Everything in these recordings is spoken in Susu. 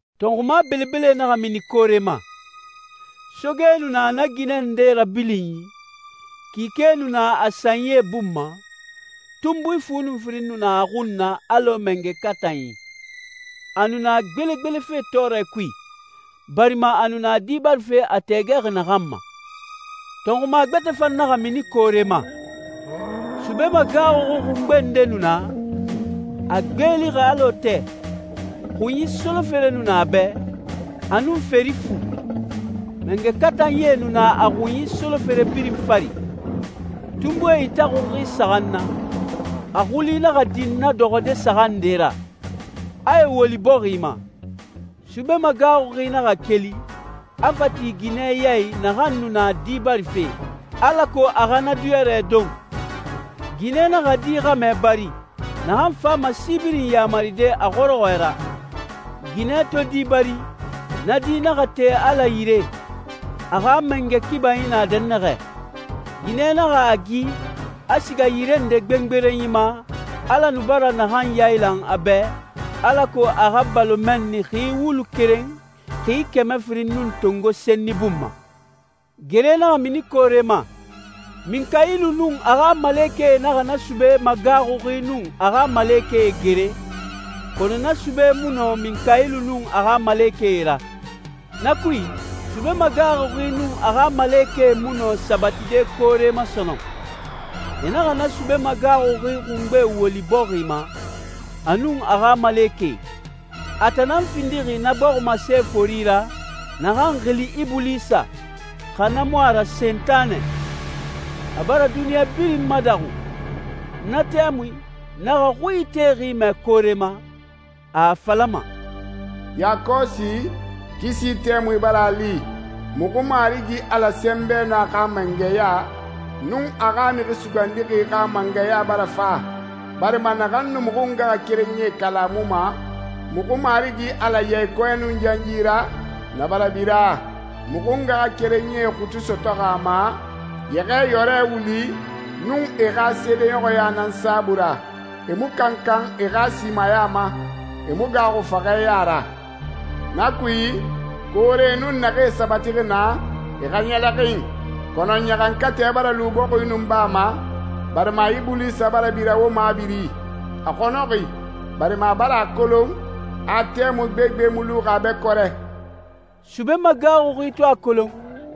Tɔnxuma belebele naxa mini koore ma. Soge nu na na ginɛ nde rabilinyi, kike nu na a sanyi bun ma, tunbui fu nun firin nu na a xun na alɔ mangɛ katanyi. A nu na gbelegbelefe tɔɔrɛ kui, barima a nu na di barife a tɛɛgɛxi naxan ma. Tɔnxuma gbɛtɛ fan naxa mini koore ma. Sube magaaxuxi xungbe nde nu na, a gbeelixi alɔ tɛ, xunyi solofere nu na a bɛ, a nun feri fu. Mangɛ katanyie nu na a xunyi solofere birin fari. Tunbui itaxunxi saxan na, a xuli naxa din na dɔxɔde saxan nde ra, a e woli bɔxi ma. Sube magaaxuxi naxa keli, a fa ti ginɛ ya i naxan nu na di barife, alako a xa na diyɔrɛ don. Ginɛ naxa di xɛmɛ bari, naxan fama si birin yamaride a xɔrɔxɔɛ ra. Ginɛ to di bari, na di naxa te Ala yire, a xa mangɛ kibanyi na dɛnnaxɛ. Ginɛ naxa a gi, a siga yire nde gbengberenyi ma Ala nu bara naxan yailan a bɛ, alako a xa balo mɛnni xi wulu keren xi kɛmɛ firin nun tongo senni bun ma. Gere naxa mini koore ma. Minkayilu nun a xa malekɛe naxa na sube magaaxuxi nun a xa malekɛe gere, kɔnɔ na sube mu nɔ Minkayilu nun a xa malekɛe ra. Na kui, sube magaaxuxi nun a xa malekɛe mu nɔ sabatide koore ma sɔnɔn. E naxa na sube magaaxuxi xungbe woli bɔxi ma, a nun a xa malekɛe. A tan nan findixi na bɔximase fori ra, naxan xili Ibulisa, xa na mu a ra Sentanɛ. A bara duniɲa birin madaxu. Na tɛmui, n naxa xui itexi mɛ koore ma, a a falama, «Yakɔsi, kisi tɛmui bara a li, muxu Marigi Ala sɛnbɛ nun a xa mangɛya, nun a xa Mixi Sugandixi xa mangɛya bara fa, barima naxan nu muxu ngaxakerenyie kalamuma muxu Marigi Ala ya i kɔɛ nun yanyi ra, na bara bira. Muxu ngaxakerenyie xutu sɔtɔxi a ma Yɛxɛɛyɔrɛ wuli nun e xa seedeɲɔxɔya nan saabui ra. E mu kankan e xa simaya ma, e mu gaaxu faxɛ ya ra. Na kui, koore nun naxee sabatixi naa, e xa ɲɛlɛxin. Kɔnɔ ɲaxankatɛ bara lu bɔxi nun baa ma, barima Ibulisa bara bira wo mabiri. A xɔnɔxi barima a bara a kolon a tɛmui gbegbe mu luxi a bɛ kɔrɛ.» Sube magaaxuxi to a kolon,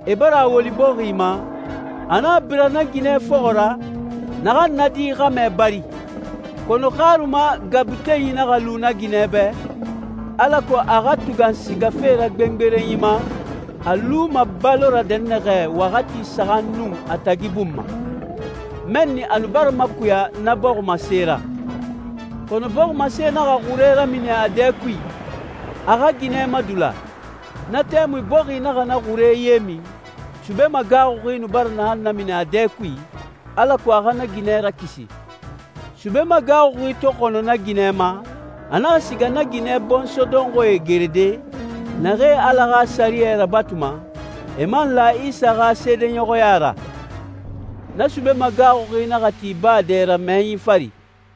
e bara a woli bɔxi ma, a naxa bira na ginɛ fɔxɔ ra, naxan na di xɛmɛ bari. Kɔnɔ xaruma gabutenyi naxa lu na ginɛ bɛ, alako a xa tugan sigafe ra gbengberenyi ma, a luma balo ra dɛnnaxɛ waxati saxan nun a tagi bun ma. Mɛnni a nu bara makuya na bɔximase ra. Kɔnɔ bɔximase naxa xure ramini a dɛ kui, a xa ginɛ madula. Na tɛmui bɔxi naxa na xure ye min, sube magaaxuxi nu bara naxan namini a dɛ kui, alako a xa na ginɛ rakisi. Sube magaaxuxi to xɔnɔ na ginɛ ma, a naxa siga na ginɛ bɔnsɔɛ dɔnxɔɛe gerede, naxee Ala xa sɛriyɛ rabatuma, e man la Isa xa seedeɲɔxɔya ra. Na sube magaaxuxi naxa ti baa dɛ ra mɛyɛnyi fari.